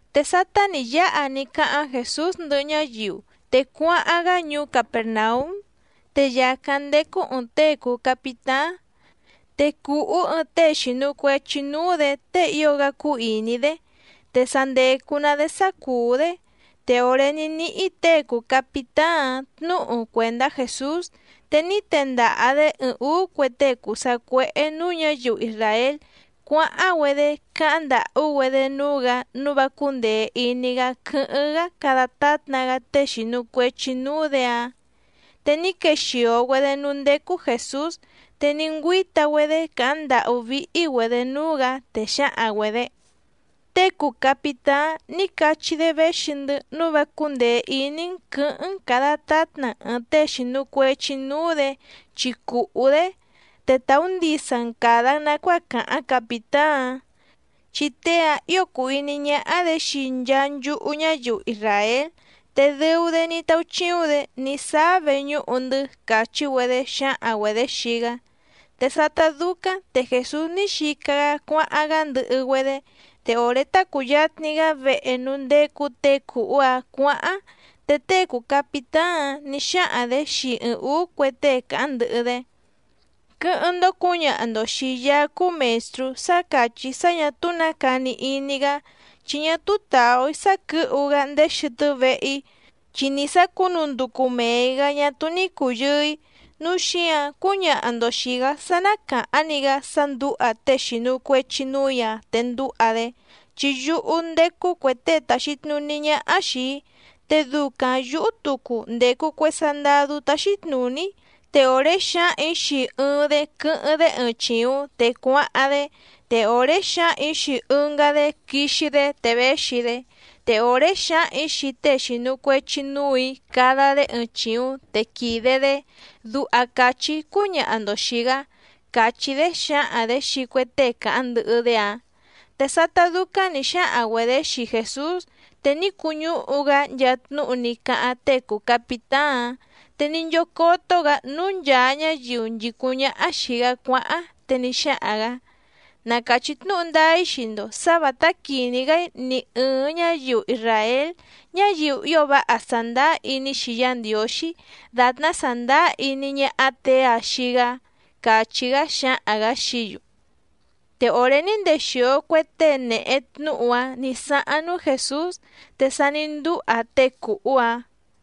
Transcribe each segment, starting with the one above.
Te sátá nǐ yáha ní cáháⁿ Jèsús ndɨhɨ ñáyiu, te cuáháⁿ‑gá ñuú Capèrnaúm. Te yàcáⁿ ndécú ɨ̀ɨⁿ tée cùu capitáⁿ, te cùhú ɨɨⁿ tée xìnu cuechi núú‑dě tée ío‑gá cúú ìní‑dé, te sa ndècu‑ná‑dé sá cùú‑dé. Te òré ní níhí těe cùu capitáⁿ‑áⁿ tnǔhu cuèndá Jèsús, te ní tendaha‑dě ɨɨⁿ ǔú cue tée cùu sacuéhé nǔú ñǎyiu isràél cuáháⁿ‑güedé cáháⁿ ndàhú‑güedé núú‑gǎ nǔu vá cúndèe iní‑gá quɨ́hɨ́ⁿ‑gá cada tátna‑gá tée xìnu cuechi núú‑dě‑áⁿ. Te ní quexìo‑güedé núú ndécú Jèsús, te ní ngüíta‑güedé càháⁿ ndàhú víhí‑güedě núú‑gǎ, te xǎhaⁿ‑güedě: —Tée cùu capitáⁿ ní cachí‑dé véxi‑ndɨ́ nǔu vá cúndèe iní‑n quɨ̌hɨ́ⁿ‑n càda tátna‑n ɨ̀ɨⁿ tée xìnu cuechi núú‑dě chi cùhú‑dé, te tàú ndisa‑n càda‑n nacuáa càháⁿ capìtáⁿ‑áⁿ, chi tée‑ǎⁿ ío cùu iní ñáhá‑dě xii nchaa nchúhú ñáyiu isràél te dɨu‑dé ní táúchíúⁿ‑dě ní sáá veñúhu‑ndɨ́ —càchí‑güedé xǎhaⁿ‑güedě xii‑gá. Te sátá dúcáⁿ te Jèsús ní xica‑gá cuáháⁿ‑gá ndɨhɨ‑güedé, te òré tá cùyatni‑gá vehe núú ndécú těe cùhú‑áⁿ cuǎháⁿ, te tée cùu capitáⁿ‑áⁿ nǐ xáhaⁿ‑dě xii ɨɨⁿ ǔú cue tée càháⁿ ndɨhɨ‑dé: —Quɨ́hɨ́ⁿ‑ndó cǔñaha‑ndo xìi Yaá cúú Mèstrú sá càchí‑í sá ñà túú nǎ cani iní‑gá, chi ñá túú tàú‑í sá quɨ̌hu‑gá ndéé xɨtɨ́ vehe‑í, chi nì sá cùnú ndúcú mèe‑í‑gá ñá túú ní cùyɨɨ‑í. Núu xíǎⁿ cúñaha‑ndo xìi‑gá sá ná càháⁿ‑ni‑gá sá ndǔha tée xìnu cuechi núù‑í‑a te ndúha‑dé. Chi yúhú ndécú cuè tée tàxi tnuní ñáhá xìi‑í, te ducaⁿ yǔhú tucu ndècu cue sandadú táxí tnùní‑í. Te òré xǎhaⁿ‑ǐ xii ɨɨⁿ‑dé quɨ́hɨ́ⁿ‑dé ɨɨⁿ chìuⁿ te cuáháⁿ‑dé, te òré xǎhaⁿ‑ǐ xii ɨngá‑dé quixi‑dé te véxi‑dé, te òré xǎhaⁿ‑ǐ xii tée xìnu cuechi núù‑í cada‑dé ɨɨⁿ chìuⁿ te quìde‑dé. Duha càchí‑í cúñaha‑ndo xìi‑gá —càchí‑dé xǎhaⁿ‑dě xii cue tée càháⁿ ndɨhɨ‑dé‑áⁿ. Te sátá dúcáⁿ nǐ xáhaⁿ‑güedě xii Jèsús, te ní cuñúhu‑gá nchaa tnúhu ní cáháⁿ tée cùu capitáⁿ‑áⁿ, te ní nchócótó‑gǎ núú nchàa ñáyiu nchìcúⁿ ñáhá xìi‑gá cuáháⁿ, te ní xáhaⁿ‑gǎ: —Na càchí tnúhu ndáá‑í xii‑ndo sǎ vǎtá quìní‑gá‑í ni ɨ̀ɨⁿ ñáyiu isràél, ñáyiu ío váha sàndáá iní‑xi Yá Ndiǒxí dàtná sàndáá iní ñáhá těe‑ǎⁿ xii‑gá —càchí‑gá xǎhaⁿ‑gǎ xií‑yu. Te òré ní ndexìo cue tée nèhe tnúhu‑áⁿ nǐ sáháⁿ núú Jèsús, te sa ní ndúha tée cùhú‑áⁿ.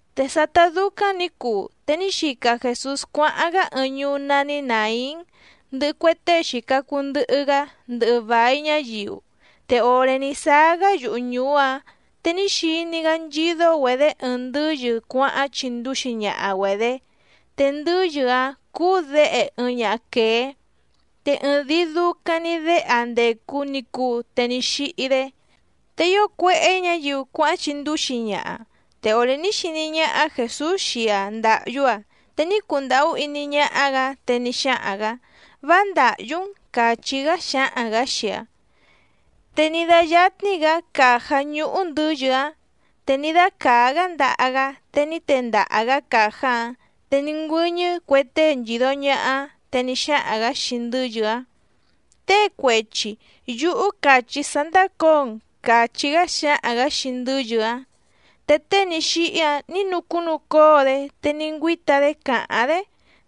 Te sátá dúcáⁿ nǐ cuu te ní xica Jèsús cuáháⁿ‑gá ɨɨⁿ ñuú nání Nàín, ndɨhɨ cue tée xìca cuu ndɨhɨ‑gá, ndɨhɨ vài ñáyiu. Te òré ní sáá‑gá yuhu ñùú‑áⁿ, te ní xiní‑gá nchídó‑güedě ɨɨⁿ ndɨ́yɨ cuáháⁿ chindúxi ñaha‑güedě, te ndɨ́yɨ‑áⁿ cúú děhe ɨɨⁿ ñaha quèé, te ɨɨⁿdìi ducaⁿ‑ni déhe‑aⁿ ndècu ni cuu te ní xíhí‑dé. Te ío cuéhé ñǎyiu cuáháⁿ chindúxi ñaha. Te òré ní xiní ñáhá Jèsús xii‑aⁿ ndàhyú‑aⁿ te ní cundàhú iní ñáhá‑gǎ, te ní xáhaⁿ‑gǎ: —Vá ndàhyú‑n —càchí‑gá xǎhaⁿ‑gǎ xii‑aⁿ. Te ní dáyátní‑gǎ càjá ñúhú ndɨ̌yɨ‑áⁿ te ní dácàá‑gá ndaha‑gá te ní tendaha‑gǎ càjá‑áⁿ, te ní ngüɨ́ñɨ́ cue tée nchìdo ñaha‑áⁿ. Te ní xáhaⁿ‑gǎ xii ndɨ́yɨ‑áⁿ: —Tée cuechi, yúhú càchí‑í sá ndácǒo‑n —càchí‑gá xǎhaⁿ‑gǎ xii ndɨ́yɨ‑áⁿ. Te tée ní xíhí‑áⁿ nǐ nucúnucóo‑dé te ní ngüíta‑dé càháⁿ‑dé,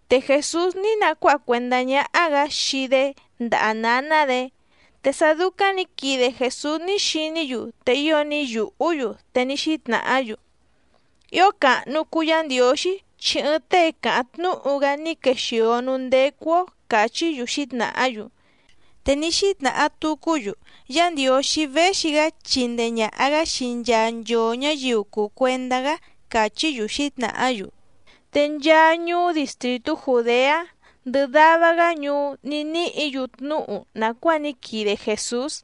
te Jèsús ní nacuáha cuèndá ñáhá‑gǎ xii‑dé ndaha nǎná‑dě. Te sá dúcáⁿ nǐ quide Jèsús ní xiní‑yu te ío ní yùhú‑yu, te ní xítnàhá‑yu: —Ío càhnu cuu Yá Ndiǒxí chi ɨɨⁿ tée càháⁿ tnúhu‑gá ní quexìo núú ndécú‑ó —càchí‑yu xǐtnàhá‑yu. Te ní xítnàha tucú‑yu: —Yá Ndiǒxí véxi‑gá chindee ñàha‑gá xii nchaa nchoo ñǎyiu cùu cuendá‑gá —càchí‑yu xǐtnàhá‑yu. Te nchaa ñuú distrìtú Jùdeá, ndɨhɨ dava‑gá ñuú ní níhǐ‑yu tnúhu nàcuáa ní quide Jèsús.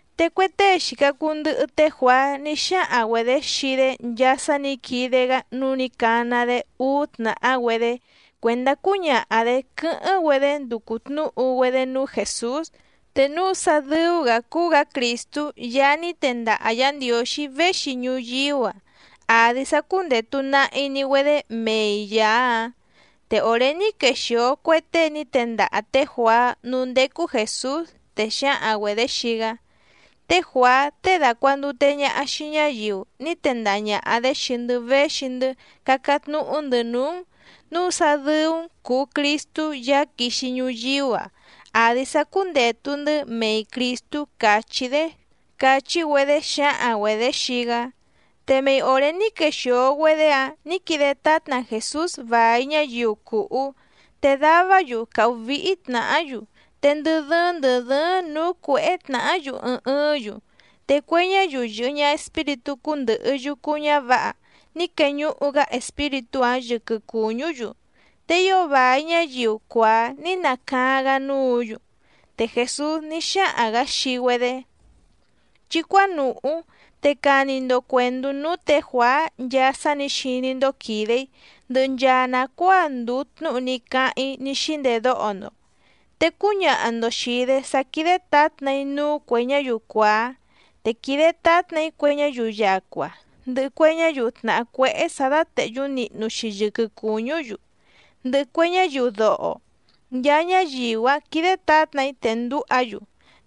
Te cue tée xìca cuu ndɨhɨ té Juàá ní xáhaⁿ‑güedě xii‑dé nchaa sá nǐ quide‑gá, núu ní cana‑dé úú tnàhá‑güedé cuèndá cúñaha‑dě quɨ́hɨ́ⁿ‑güedé nducu tnǔhu‑güedé núú Jèsús, te núu sá dɨ́ú‑gǎ cúú‑gǎ Crìstú Yaá ní tendaha Yǎ Ndiǒxí véxi ñuyíú‑a àdi sá cúndètu nahi‑ni‑güedé mei Yàá‑áⁿ. Te òré ní quexìo cue tée ní tendaha tě Juàá núú ndécú Jèsús, te xǎhaⁿ‑güedě xii‑gá: —Té Juàá tée dàcuandute ñaha xii ñáyiu ní tendaha ñàha‑dé xii‑ndɨ́ véxi‑ndɨ́ cácáⁿ tnúhú‑ndɨ̌ núú‑n, núu sá dɨ́ú‑n cùu Cristú Yaá quixi ñuyíú‑a, àdi sá cúndètu‑ndɨ́ mei Crìstú càchí‑dé —càchí‑güedé xǎhaⁿ‑güedě xii‑gá. Te mei òré ní quexìo‑güedé‑áⁿ nǐ quide tátna Jèsús vài ñáyiu cùhú, te davá‑yu càhú víhí tnàhá‑yu, te ndɨ dɨ́ɨ́ⁿ ndɨ̀ dɨ́ɨ́ⁿ nǔú cuèhé tnàhá‑yu ɨɨⁿ ɨɨ́ⁿ‑yu, te cue ñáyiu yɨ̀hɨ ñaha espíritú cúndɨ̀hɨ yucu ñávǎha ní queñuhu‑gá espíritú‑áⁿ yɨquɨ cùñú‑yu, te ío vài ñáyiu cuàá ní nacaáⁿ‑gá núǔ‑yu. Te Jèsús ní xáhaⁿ‑gǎ xii‑güedé: —Chí cuánùhú te cani‑ndo cuèndú núú tě Juàá nchaa sá nǐ xiní‑ndó quìde‑í, ndɨhɨ nchaa nàcuáa ndùu tnúhu ní cáháⁿ‑í ní xíndedóho‑ndo. Te cúñaha‑ndo xìi‑dé sá quídé tǎtna‑í núú cuè ñáyiu cuàá, te quìde tátna‑í cue ñáyiu yacua, ndɨhɨ cue ñáyiu tnàhá cuéhé sǎ dátèhyú nihnu‑xi yɨquɨ cùñú‑yu, ndɨhɨ cue ñáyiu doho, nchaa ñáyiu‑áⁿ quìde tátna‑í te ndǔha‑yu,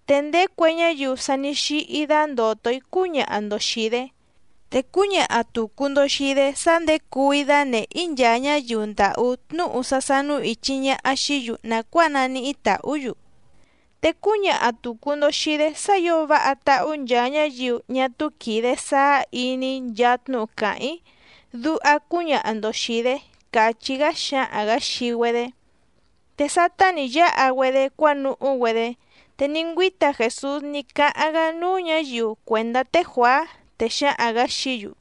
te ndéé cue ñáyiu sa ní xíhí dándòto‑í cúñaha‑ndo xìi‑dé, te cúñaha tùcu‑ndo xii‑dé sá nděcuu‑í dánèhé‑í nchaa ñáyiu ndàhú tnúhu sá sánú ìchi ñaha xií‑yu nàcuáa naníhí tàhú‑yu. Te cúñaha tùcu‑ndo xii‑dé sá ǐo váha táhú nchaa ñáyiu ñá túú quìde sáá iní nchaa tnúhu càháⁿ‑í, duha cúñaha‑ndo xìi‑dé —càchí‑gá xǎhaⁿ‑gǎ xii‑güedé. Te sátá nǐ yáha‑güedé cuánuhú‑güedé, te ní ngüíta Jèsús ní cáháⁿ‑gá núú ñǎyiu cuèndá té Juàá, te xǎhaⁿ‑gǎ xií‑yu: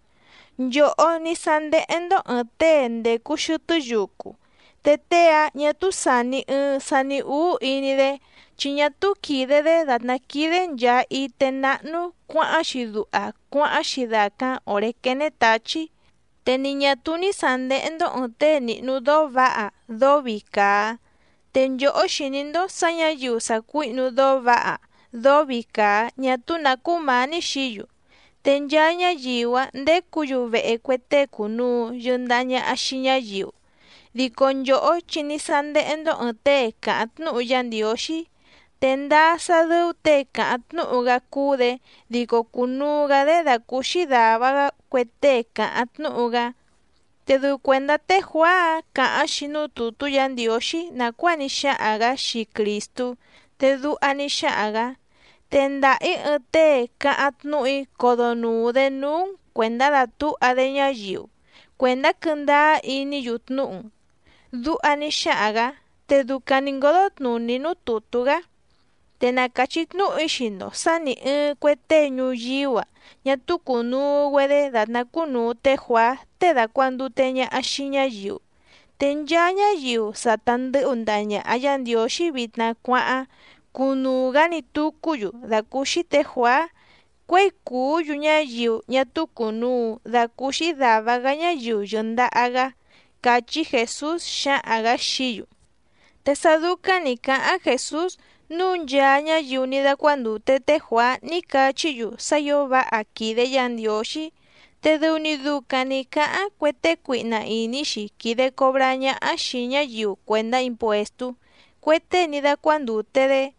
—Nchòhó ní sándéhé‑ndó ɨ̀ɨⁿ tée ndècu xɨtɨ́ yucu, te tée‑áⁿ ñà túú sàni ɨɨⁿ sani úú iní‑dé, chi ñá túú quìde‑dé dàtná quídé nchàa ité náhnú cuǎháⁿ‑xi duha cuáháⁿ‑xi dàcáⁿ òré quéné tǎchí. Te ni ñà túú ní sàndéhé‑ndó ɨ̀ɨⁿ tée nìhnu dóó vǎha dóó vii càa. Te nchòhó xìní‑ndó sǎ ñǎyiu sàcuíhnu dóó vǎha dóó vii càa ñá túú nǎ cúmǎní xií‑yu, te nchaa ñáyiu‑áⁿ ndécǔ‑yu vehe cue tée cùnuu yɨndaha ñaha xii ñáyiu. Dico nchòhó chi ní sándéhé‑ndó ɨ̀ɨⁿ tée càháⁿ tnúhu Yá Ndiǒxí. Te ndáá sá dɨ́ú těe càháⁿ tnúhu‑gá cúú‑dě dico cùnuu‑gá‑dé dàcúúxí dàva‑gá cue tée càháⁿ tnúhu‑gá. Te dɨu cuèndá té Juàá‑áⁿ càháⁿ‑xi núú tùtú Yǎ Ndiǒxí nàcuáa ní xáhaⁿ‑gǎ xii Crìstú, te duha ní xáhaⁿ‑gǎ: Tendaha‑ǐ ɨɨⁿ tée cáháⁿ tnúhu‑í codonùu‑dé núú‑n cuèndá dàtúha‑dé ñáyiu cuèndá quɨ́ndáá iní‑yu tnúhu‑n. Duha ní xáhaⁿ‑gǎ, te ducaⁿ nǐ ngódó tnùní núú tùtú‑gá. Te na càchí tnúhu‑í xii‑ndo sǎ nì ɨɨⁿ cue tée ñuyíú‑a ñá túú cùnuu‑güedé dàtná cúnùu té Juàá tée dàcuandute ñaha xii ñáyiu. Te nchaa ñáyiu sa ta ndɨ̌hu ndaha ñàha Yá Ndiǒxí vitna cuáháⁿ cúnùu‑gá‑ni tucú‑yu dàcúúxí tě Juàá cuěi cùú‑yu ñáyiu ñá túú cùnuu dacúúxí dàva‑gá ñáyiu yɨ̀ndaha‑gá —càchí Jèsús xǎhaⁿ‑gǎ xií‑yu. Te sá dúcáⁿ nǐ cáháⁿ Jèsús, núu nchaa ñáyiu ní dácuándùte té Juàá ní cachí‑yu sá ǐo váha quìde Yá Ndiǒxí, te dɨu‑ni ducaⁿ nǐ cáháⁿ cue tée cuihna ìní‑xi quìde cobrá ñáhá xìi ñáyiu cuèndá impuèstú, cue tée ní dácuándùte‑dé.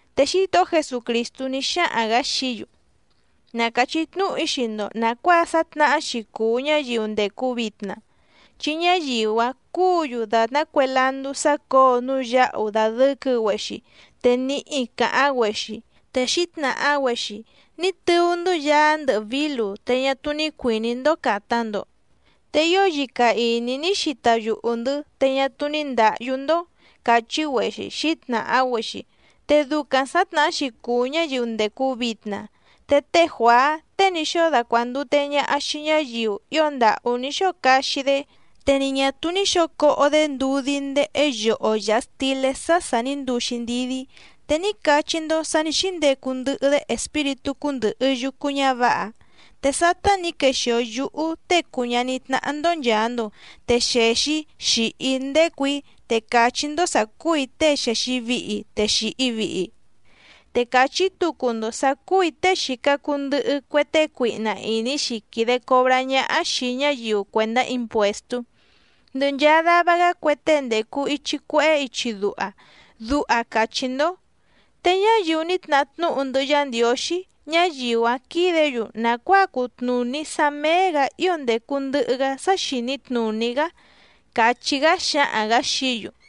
Te Xítohó Jesucrìstú ní xáhaⁿ‑gǎ xií‑yu: —Na càchí tnúhu‑í xii‑ndo nàcuáa sǎtnahá‑xi cùu ñáyiu ndècu vitna. Chi ñáyiu‑áⁿ cúǔ‑yu dàtná cue landú sácǒo núú yǎhu dàdɨquɨ‑güexi te níhi càháⁿ‑güexi, te xǐtnàha‑güexi: “Ní tɨú‑ndɨ́ yaá ndɨhɨ vǐlu te ñá túú ní cuìní‑ndó càta‑ndo. Te ío yica ìní ní xita yuhu‑ndɨ̌ te ñá túú ní ndǎhyú‑ndó”, càchí‑güexi xǐtnàha‑güexi. Te ducaⁿ sǎtnahá‑xi cùu ñáyiu ndècu vitna. Te té Juàá tée ní xóo dacuàndute ñaha xii ñáyiu ío ndàhú ní xóo caxi‑dé, te ni ñà túú ní xǒo coho‑dé ndudí ndéhé yoho yàha stilé sá sà ní nduu‑xi ndidí, te ní cachí‑ndó sǎ nǐ xíndecu ndɨhɨ‑dé espíritú cúndɨ̀hɨ yucu ñávǎha. Te sátá nǐ quexìo yúhú Tée cùu ñaní tnáhá‑ndó nchàa‑ndo, te xèxi‑í xìhi‑í ndécù‑í te càchí‑ndó sǎ cúù‑í tée xèxi vihi te xìhi vihi‑í. Te càchí tucu‑ndo sǎ cúù‑í tée xìca cuu ndɨhɨ cue tée cuihna ìní‑xi quìde cobrá ñáhá xìi ñáyiu cuèndá impuèstú, ndɨhɨ nchaa dava‑gá cue tée ndècu ichi cuehé ichi duha, duha càchí‑ndó. Te ñáyiu ní tnahá tnúhu ndɨhɨ Yá Ndiǒxí, ñáyiu‑áⁿ quídě‑yu nàcuáa cutnùní sá méé‑gǎ ío ndècu ndɨhɨ‑gá sá xìní tnùní‑gá —càchí‑gá xǎhaⁿ‑gǎ xií‑yu.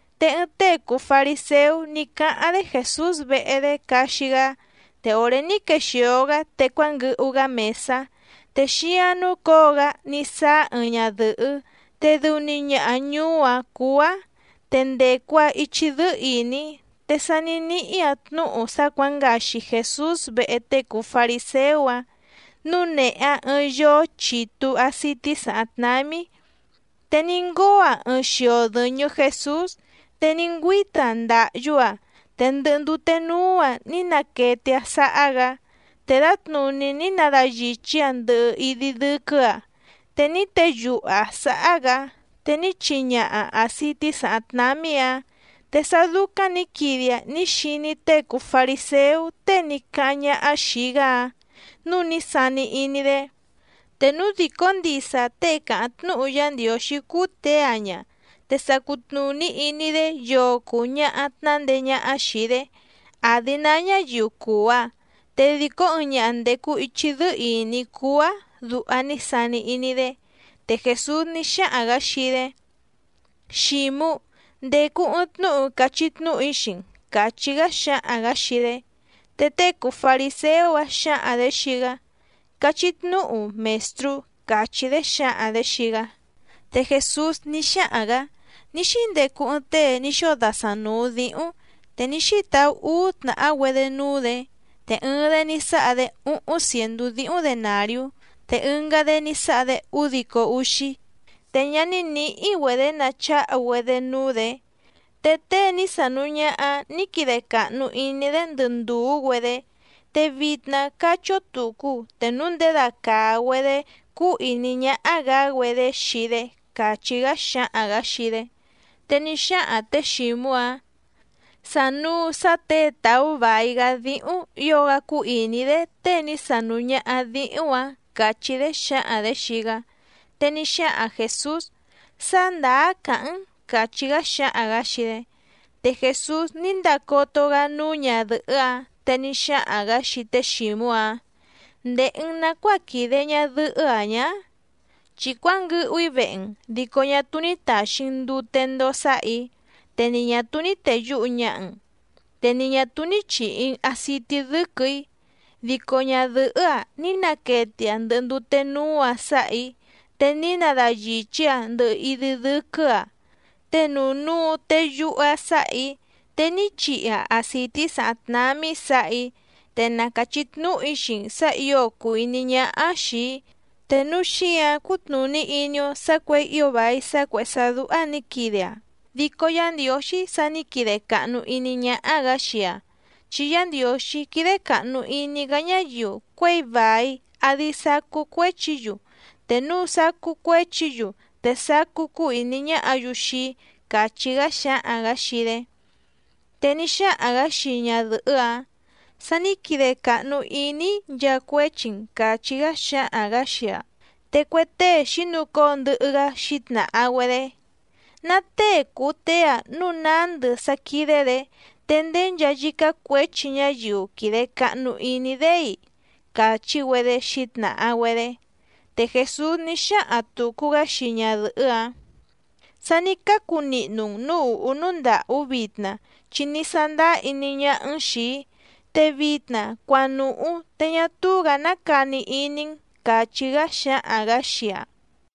Te ɨɨⁿ tée cùu fariséú ní cáháⁿ‑dé Jèsús vehe‑dé caxi‑gá, te òré ní quexìo‑gá te cuánguɨhu‑gá mèsá. Te xíáⁿ núcǒo‑gá ní sáá ɨɨⁿ ñadɨ̀hɨ́ te dɨu‑ni ñaha ñuú‑áⁿ cúú‑áⁿ, te ndècu‑aⁿ ichi dɨ́ɨ́ ìní, te sá nǐ níhí‑aⁿ tnúhu sá cuǎngaxi Jèsús vehe tée cùu fariséú‑áⁿ, núu nèhe‑aⁿ ɨɨⁿ yoó chitu àcití sàháⁿ tnámí. Te ní ngóo‑aⁿ ɨɨⁿ xio dɨ̀ñɨ Jesús, te ní ngüíta‑aⁿ ndàhyú‑aⁿ te ndɨhɨ ndute núú‑aⁿ ní naquete‑aⁿ sáhá‑gǎ. Te dǎtnùní ní nadayìchí‑aⁿ ndɨhɨ idi dɨ́quɨ́‑aⁿ, te ní teyuhu‑aⁿ sǎhá‑gǎ, te ní chihi ñaha‑aⁿ àcití sàháⁿ tnámí‑ǎⁿ. Te sá dúcáⁿ nǐ quide‑aⁿ ní xiní tée cùu fariséú tée ní cáháⁿ ñáhá xìi‑gá‑áⁿ nǔu ní sani iní‑dé: “Te núu dìcó ndisa tée càháⁿ tnúhu Yá Ndiǒxí cúú těe‑a ña, te sa cutnùní iní‑dé yoo cùu ñaha tnándeé ñáhá xìi‑dé, àdi ná ñáyiu cùu‑aⁿ, te dìcó ɨɨⁿ ñaha ndècu ichi dɨ́ɨ́ ìní cúú‑áⁿ”, duha ní sani iní‑dé. Te Jèsús ní xáhaⁿ‑gǎ xii‑dé: —Xǐmú, ndècu ɨɨⁿ tnúhu cachí tnúhu‑í xii‑n —càchí‑gá xǎhaⁿ‑gǎ xii‑dé. Te tée cùu fariséú‑áⁿ xǎhaⁿ‑dě xii‑gá: —Cachí tnúhu, Mèstrú —càchí‑dé xǎhaⁿ‑dě xii‑gá. Te Jèsús ní xáhaⁿ‑gǎ: —Ní xíndecu ɨɨⁿ tée ní xóo dasaⁿ nùu díhúⁿ, te ní xítaú úú tnàhá‑güedé núú‑dě. Te ɨɨⁿ‑dé ní sáha‑dé úhúⁿ cièndú díhúⁿ denàriú, te ɨngá‑dé ní sáha‑dé údico úxí. Te ñá ní nǐhí‑güedě nacháhu‑güedé núú‑dě, te tée ní sánùu ñaha‑áⁿ nǐ quide càhnu iní‑dé ndɨ ndùú‑güedé. Te vitna cachí‑ǒ tucu te núu nděda càa‑güedé cúú ìní ñáhá‑gǎ‑güedé xii‑dé —càchí‑gá xáhaⁿ‑gǎ xii‑dé. Te ní xáhaⁿ tě Xǐmú‑áⁿ: —Sànuu sá těe tàú vài‑gá díhúⁿ ǐo‑gá cúú ìní‑dé tée ní sánùu ñaha díhúⁿ‑ǎⁿ —càchí‑dé xǎhaⁿ‑dě xii‑gá. Te ní xáhaⁿ Jèsús: —Sá ndàá càháⁿ‑n —càchí‑gá xáhaⁿ‑gǎ xii‑dé. Te Jèsús ní ndacoto‑gá núú ñadɨ̀hɨ́‑áⁿ, te ní xáhaⁿ‑gǎ xii té Xǐmú‑áⁿ: —¿Ndèhe‑n nacuáa quìde ñadɨhɨ́‑a ñǎ? Chi cuánguɨhu‑í vehe‑n, dico ñá túú ní tàxi‑n ndute ndoo sáhà‑í, te ni ñà túú ní tèyuhu ñaha‑n, te ni ñà túú ní chìhi‑n acití dɨ́quɨ̀‑í, dico ñadɨ̀hɨ́‑a ní naquete‑aⁿ ndɨhɨ ndute núú‑aⁿ sǎhà‑í, te ní nadayìchí‑aⁿ ndɨhɨ idi dɨ́quɨ́‑aⁿ, te nuu núu teyuhu‑aⁿ sáhà‑í, te ní chihi‑aⁿ acìtí sàháⁿ tnámí sǎhà‑í. Te na càchí tnúhu‑í xii‑n sǎ ǐo cùu iní ñáhá‑áⁿ xìi‑í, te núu xíǎⁿ cútnùní iní‑ó sǎ cuěi ío vài sá cuèhé sá dúhá nǐ quide‑aⁿ, dico Yá Ndiǒxí sa ní quide càhnu iní ñáhá‑gǎ xii‑aⁿ. Chi Yá Ndiǒxí quídé càhnu iní‑gá ñáyiu cuěi vài àdi sacú cuéchi‑yu, te núu sacú cuéchi‑yu te sacú cúú ìní ñáhǎ‑yu xii‑í —càchí‑gá xáhaⁿ‑gǎ xii‑dé. Te ní xáhaⁿ‑gǎ xii ñadɨ̀hɨ́‑áⁿ: —Sa ní quide càhnu iní‑í nchaa cuéchi‑n —càchí‑gá xáhaⁿ‑gǎ xii‑aⁿ. Te cue tée xǐnucóo ndɨhɨ‑gá xǐtnàha‑güedé: —¿Ná tée cùu tée‑a núu nándɨ sá quídé‑dě, te ndéé nchaa yícá cuěchi ñáyiu quìde cahnu iní‑dé‑i? —càchí‑güedé xǐtnàha‑güedé. Te Jèsús ní xáhaⁿ tùcu‑gá xii ñadɨ̀hɨ́‑áⁿ: —Sa ní cácu nihnu‑n nǔú ùhú núú ndàhú vitna chi ní sándáá iní ñáhá‑n xìi‑í, te vitna cuanùhú te ñá túú‑gǎ ná cani iní‑n —càchí‑gá xáhaⁿ‑gǎ xii‑aⁿ.